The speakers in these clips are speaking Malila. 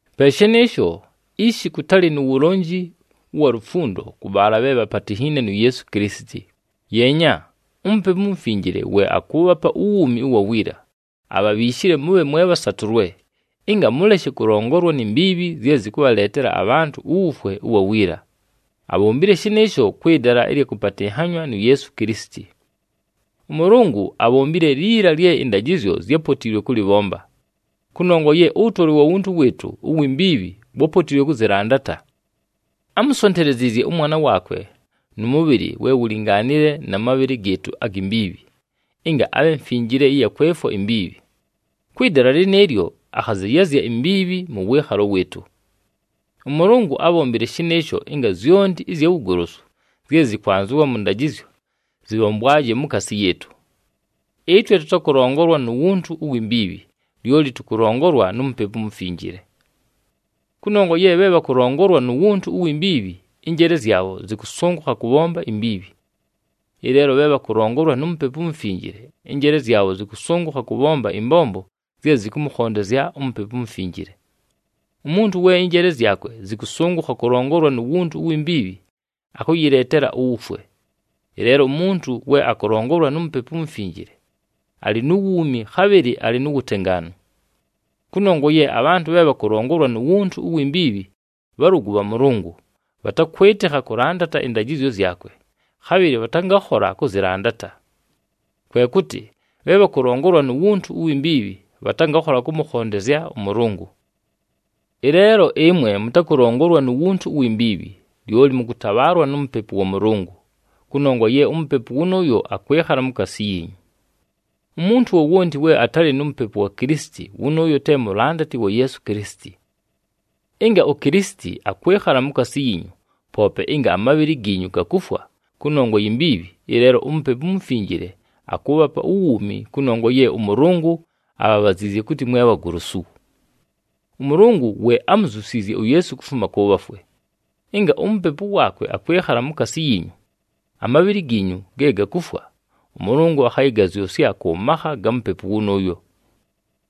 Pe shɨnɨɨsho, ishi kʉtalɨ nu wulonji ʉwa lufundo kʉ bhaala bhe bhapatinhiine nu Yeesu Kilisiti. Yeenya, uMupepu uMufinjile we akʉʉbhapa uwuumi ʉwa wiila, abhabhiishile mʉbhe mwe bhasatʉlwe, ɨnga mʉleshe kʉlongolwa ni mbiibhi zye zɨkʉbhaleetela abhantʉ uwufwe ʉwa wiila. Abhombile shɨnɨɨsho kwɨ dala ɨlya kʉpatɨnhanywa nu Yeesu Kilisiti. ɄMʉlʉngʉ abhombile liila lye ɨndajɨzyo zyápotiilwe kʉlɨbhomba, kʉnongwa ye ʉwʉtolwe wa wuntu wɨɨtʉ uwi mbiibhi wápotiilwe kʉzɨlandata. Ámusonteleziizye ʉMwana waakwe nʉ mʉbhɨlɨ we wulingaanile na mabhɨlɨ gɨɨtʉ agi mbiibhi, ɨnga abhe mfinjile ɨya kwefwa imbiibhi. Kwɨ dala lɨnɨɨlyo akhazɨyazya imbiibhi mʉ wɨɨkhalo wɨɨtʉ. ɄMʉlʉngʉ ábhombile shɨnɨɨsho ɨnga zyonti ɨzya wugolosu zye zɨkwanzɨwa mʉ ndajɨzyo zɨbhombwaje mukaasi yɨɨtʉ. Ɨtwe tʉtakʉlongolwa nu wuntu uwi mbiibhi, lyoli tʉkʉlongolwa nu Mupepu uMufinjile. Kʉnongwa ye bhe bhakʉlongolwa nu wuntu uwi mbiibhi, ɨnjeele zyabho zɨkʉsʉngʉkha kʉbhomba imbiibhi. Ɨleelo, bhe bhakʉlongolwa nu Mupepu uMufinjile, ɨnjeele zyabho zɨkʉsʉngʉkha kʉbhomba ɨmbombo zye zɨkʉmʉkhondezya uMupepu uMufinjile. Umuntu we ɨnjeele zyakwe zɨkʉsʉngʉkha kʉlongolwa nu wuntu uwi mbiibhi, akʉyɨleetela uwufwe. Ɨleelo umuntu we akʉlongolwa nu Mupepu uMufinjile, alɨ nu wuumi, khabhɨlɨ alɨ nu wutengaanu. Kʉnongwa ye abhantʉ bhe bhakʉlongolwa nu wuntu uwi mbiibhi bhalʉgʉ bha Mʉlʉngʉ, bhatakwɨtɨkha kʉlandata ɨndajɨzyo zyakwe, khabhɨlɨ bhatangakhola kʉzɨlandata. Kwe kʉtɨ, bhe bhakʉlongolwa nu wuntu uwi mbiibhi bhatangakhola kʉmʉkhondezya ʉMʉlʉngʉ. Ɨleelo, ɨmwe mʉtakʉlongolwa nu wuntu uwi mbiibhi, lyoli mʉkʉtabhaalwa nu Mupepu wa Mʉlʉngʉ, kʉnongwa ye uMupepu wʉnʉʉyo akwɨkhala mukaasi yiinyu. Umuntu wowonti we atalɨ nu Mupepu wa Kilisiti wʉnʉʉyo te mulandati wa Yeesu Kilisiti. Ɨnga uKilisiti akwɨkhala mukaasi yiinyu, poope ɨnga amabhɨlɨ giinyu gakufwa kʉnongwa yi mbiibhi, ɨleelo uMupepu uMufinjile akʉʉbhapa uwuumi kʉnongwa ye ʉMʉlʉngʉ abhabhaziizye kʉtɨ mwe bhagolosu. ɄMʉlʉngʉ we ámuzyusiizye uYeesu kufuma kʉ bhafwe. Ɨnga uMupepu waakwe akwɨkhala mukaasi yiinyu, amabhɨlɨ giinyu ge gakufwa, ʉMʉlʉngʉ akhayɨgazyʉsya kʉ makha ga Mupepu wʉnʉʉyo.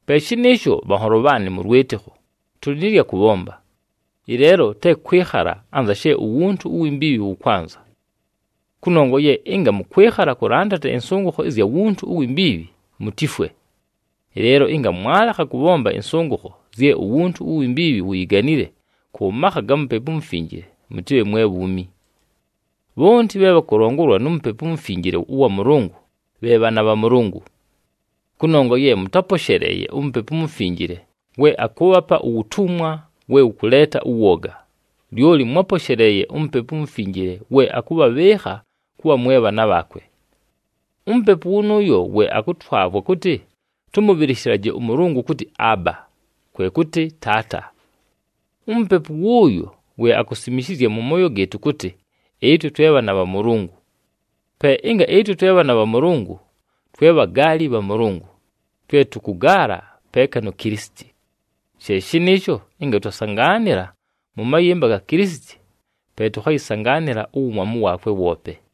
Pe shɨnɨɨsho, bhanholo bhaanɨ mʉ lwɨtɨkho, tʉlɨ nɨ lya kʉbhomba, ɨleelo te kwɨkhala anza she uwuntu uwi mbiibhi wʉkwanza. Kʉnongwa ye ɨnga mʉkwɨkhala kʉlandata ɨnsʉngʉkho ɨzya wuntu uwi mbiibhi, mutifwe. Ɨleelo ɨnga mwalekha kʉbhomba ɨnsʉngʉkho zye uwuntu uwi mbiibhi wuyiganile kʉ makha ga Mupepu uMufinjile, mʉtɨbhe mwe bhuumi. Bhonti bhe bhakʉlongolwa nu Mupepu uMufinjile ʉwa Mʉlʉngʉ bhe bhaana bha Mʉlʉngʉ. Kʉnongwa ye mʉtáposheleeye uMupepu uMufinjile we akʉʉbhapa uwutumwa we wʉkʉleeta ʉwoga, lyoli mwáposheleeye uMupepu uMufinjile we akʉbhabhɨɨkha kʉbha mwe bhaana bhaakwe. UMupepu wʉnʉʉyo we akʉtwavwa kʉtɨ tʉmʉbhɨlɨshɨlaje ʉMʉlʉngʉ kʉtɨ, “Aaba,” kwe kʉtɨ, “Taata.” UMupepu wʉʉyo we akusimishizya mʉ mooyo gɨɨtʉ kʉtɨ, ɨtwe twe bhaana bha Mʉlʉngʉ. Pe ɨnga ɨtwe twe bhaana bha Mʉlʉngʉ, twe bhagaali bha Mʉlʉngʉ, twe tʉkʉgaala peeka nu Kilisiti. She shɨnɨɨsho ɨnga twasangaanɨla mʉ mayɨmba ga Kilisiti, pe tʉkhayɨsangaanɨla uwumwamu waakwe woope.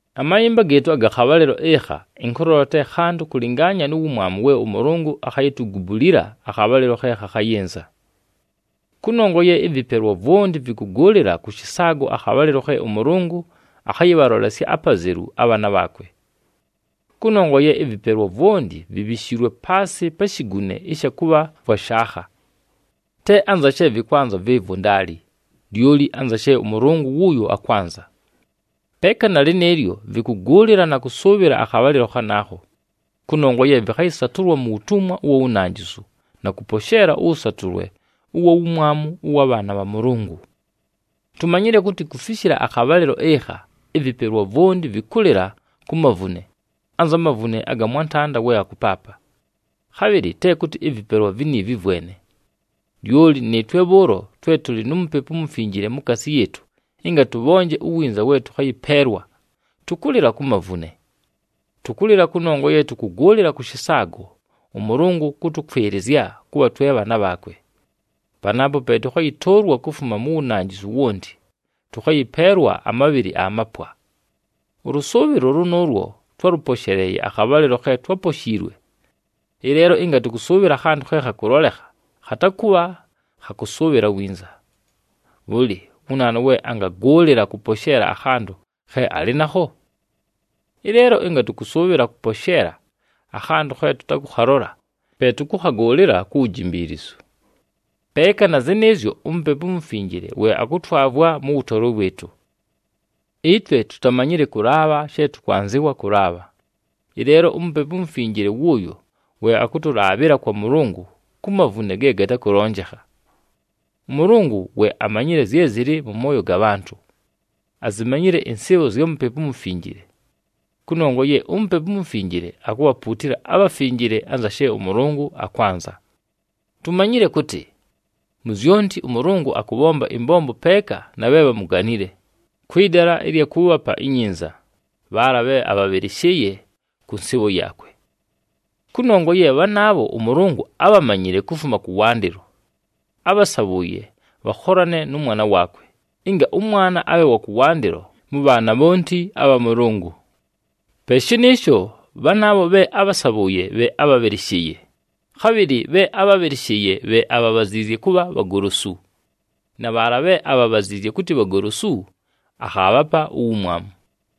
Amayɨmba gɨɨtʉ aga khabhalɨlo ɨkha ɨnkʉlola te khantʉ kʉlɨngaanya nu wumwamu we ʉMʉlʉngʉ akhayitugubulila akhabhalɨlo khe khakhayɨnza. Kʉnongwa ye ɨvɨpelwa vwonti vɨkʉgʉʉlɨla kʉ shɨsaago akhabhalɨlo khe ʉMʉlʉngʉ akhayɨbhalolesya apazelu abhaana bhaakwe. Kʉnongwa ye ɨvɨpelwa vwonti vibhishiilwe paasɨ pa shigune ɨsha kʉbha vwa shaakha. Te anza she vɨkwanza vɨɨvwo, ndaali, lyoli anza she ʉMʉlʉngʉ wʉʉyo akwanza. Peeka na lɨnɨɨlyo, vɨkʉgʉʉlɨla na kʉsʉʉbhɨla akhabhalɨlo khanaakho, kʉnongwa ye vɨkhayɨsatʉlwa mu wutumwa ʉwa wunanjisu na kʉposheela ʉwʉsatʉlwe ʉwa wumwamu ʉwa bhaana bha Mʉlʉngʉ. Tumanyile kʉtɨ kufishila akhabhalɨlo ɨkha, ɨvɨpelwa vwonti vɨkʉlɨla ku mavune, anza mavune aga mwantanda we akʉpaapa. Khabhɨlɨ te kʉtɨ ɨvɨpelwa viniivi vwene, lyoli nɨɨtwe bhʉʉlo twe tʉlɨ nu Mupepu uMufinjile mukaasi yɨɨtʉ ɨnga tʉbhonje uwinza we tʉkhayɨpeelwa, tʉkʉlɨla ku mavune. Tʉkʉlɨla kʉnongwa ye tʉkʉgʉʉlɨla kʉ shɨsaago, ʉMʉlʉngʉ kʉtʉkwɨlɨzya kʉbha twe bhaana bhaakwe. Panaapo pe tʉkhayɨtʉʉlwa kufuma mu wunanjisu wonti, tʉkhayɨpeelwa amabhɨlɨ amapwa. Ʉlʉsʉʉbhɨlo lʉnʉʉlwo twálʉposheleeye akhabhalɨlo khe twáposhiilwe. Ɨleelo ɨnga tʉkʉsʉʉbhɨla akhantʉ khe khakʉlolekha, khatakʉbha kha kʉsʉʉbhɨla winza. Bhʉlɨ, wu naanu we angagʉʉlɨla kʉposheela akhantʉ khe alɨ nakho? Ɨleelo ɨnga tʉkʉsʉʉbhɨla kʉposheela akhantʉ khe tʉtakʉkhalola, pe tʉkʉkhagʉʉlɨla ku wujimbiilizu. Peeka na zɨnɨɨzyo, uMupepu uMufinjile we akʉtwavwa mʉ wʉtolwe wɨɨtʉ. Ɨtwe tutamanyile kʉlaabha she tʉkwanzɨwa kʉlaabha. Ɨleelo uMupepu uMufinjile wʉʉyo we akʉtʉlaabhɨla kwa Mʉlʉngʉ ku mavune ge gatakʉlonjekha. ɄMʉlʉngʉ we amanyile zye zɨlɨ mʉ mooyo ga bhantʉ, azimanyile ɨnsɨɨbho zya Mupepu uMufinjile. Kʉnongwa ye uMupepu uMufinjile akubhapuutila abhafinjile anza she ʉMʉlʉngʉ akwanza. Tumanyile kʉtɨ, mu zyonti ʉMʉlʉngʉ akʉbhomba ɨmbombo peeka na bhe bhamuganile, kwɨ dala ɨlya kʉʉbhapa inyinza, bhaala bhe abhabhɨlɨshɨɨye kʉ nsɨɨbho yaakwe. Kʉnongwa ye bhanaabho ʉMʉlʉngʉ ábhamanyile kufuma kʉwandɨlo, ábhasabhʉʉye bhakholane nʉ mwana waakwe, ɨnga ʉMwana abhe wa kʉwandɨlo mʉ bhaana bhonti abha Mʉlʉngʉ. Pe shɨnɨɨsho, bhanaabho bhe ábhasabhʉʉye bhe ábhabhɨlɨshɨɨye, khabhɨlɨ bhe ábhabhɨlɨshɨɨye bhe abhabhaziizye kʉbha bhagolosu, na bhaala bhe abhabaziizye kʉtɨ bhagolosu akhaabhapa uwumwamu.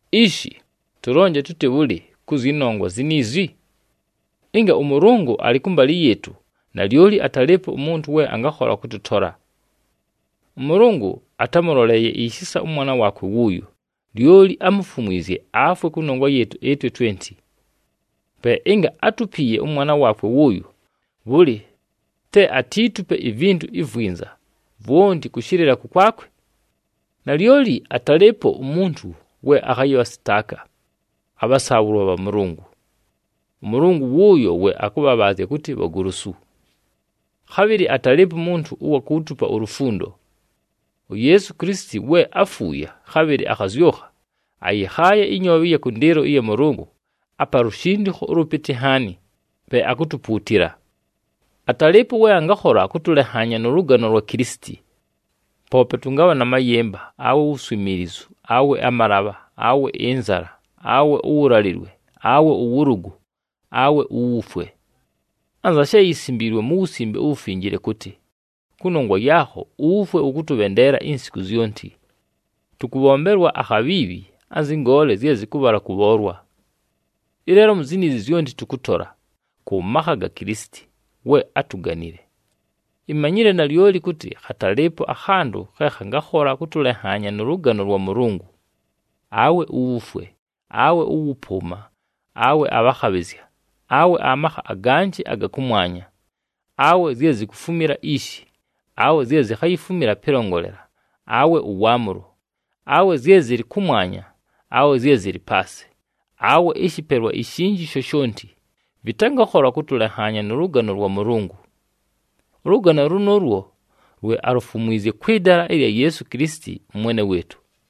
Ishi, tʉlonje tʉtɨ bhʉlɨ kʉ zyɨ nongwa ziniizi? Ɨnga ʉMʉlʉngʉ alɨ kʉmbalɨ yɨɨtʉ, nalyoli atalɨɨpo umuntu we angakhola kʉtʉtola. ɄMʉlʉngʉ atámʉloleeye ishisa ʉmwana waakwe wʉʉyo, lyoli ámufumwizye afwe kʉnongwa yɨɨtʉ ɨtwe twenti. Pe ɨnga átupiiye ʉmwana waakwe wʉʉyo, bhʉlɨ te atiitupe ivintu ivwinza vwonti kʉshɨlɨla kʉkwakwe! Nalyoli atalɨɨpo umuntu we akhayɨbhasɨtaaka abhasaabhʉlwa bha Mʉlʉngʉ. ɄMʉlʉngʉ wʉʉyo we akʉbhabhaazya kʉtɨ bhagolosu. Khabhɨlɨ atalɨɨpo umuntu ʉwa kuutupa ulufundo. UYeesu Kilisiti we áfuuye, khabhɨlɨ akhazyʉkha, ayɨkhaaye ɨnyoobhe ɨya kʉndɨɨlo ɨya Mʉlʉngʉ, apa lushindikho ʉlʉpɨtɨ nhaani, pe akutupuutila. Atalɨɨpo we angakhola kʉtʉlenhaanya nʉ lʉgano lwa Kilisiti! Poope tʉngabha na mayɨmba, awe uwuswimiilizu, awe amalabha, awe ɨnzala, awe ʉwʉlalɨwe, awe ʉwʉlʉgʉ, awe uwufwe. Anza she yisimbiilwe mu Wusimbe uWufinjile kʉtɨ, “Kʉnongwa yaakho, uwufwe wʉtʉkʉbhendeela insiku zyonti. Tʉkʉbhombelwa akhabhiibhi, anzɨ ngoole zye zɨkʉbhala kʉbhoolwa.” Ɨleelo mu ziniizi zyonti, tʉkʉtola, kʉ makha ga Kilisiti, we átuganile. Imanyile nalyoli kʉtɨ khatalɨɨpo akhantʉ khe khangakhola kʉtʉlenhaanya nʉ lʉgano lwa Mʉlʉngʉ: awe uwufwe, awe ʉwʉpʉʉma, awe abhakhabhɨzya, awe amakha aganjɨ aga kʉmwanya, awe zye zikufumila ishi, awe zye zikhayifumila pɨlongolela, awe ʉwaamʉlo, awe zye zɨlɨ kʉmwanya, awe zye zɨlɨ paasɨ, awe ɨshɨpelwa ishinji shoshonti, vɨtangakhola kʉtʉlenhaanya nʉ lʉgano lwa Mʉlʉngʉ. Ʉlʉgano lʉnʉʉlwo lwe alufumwizye kwɨ dala ɨlya Yeesu Kilisiti, ʉMwene wɨɨtʉ.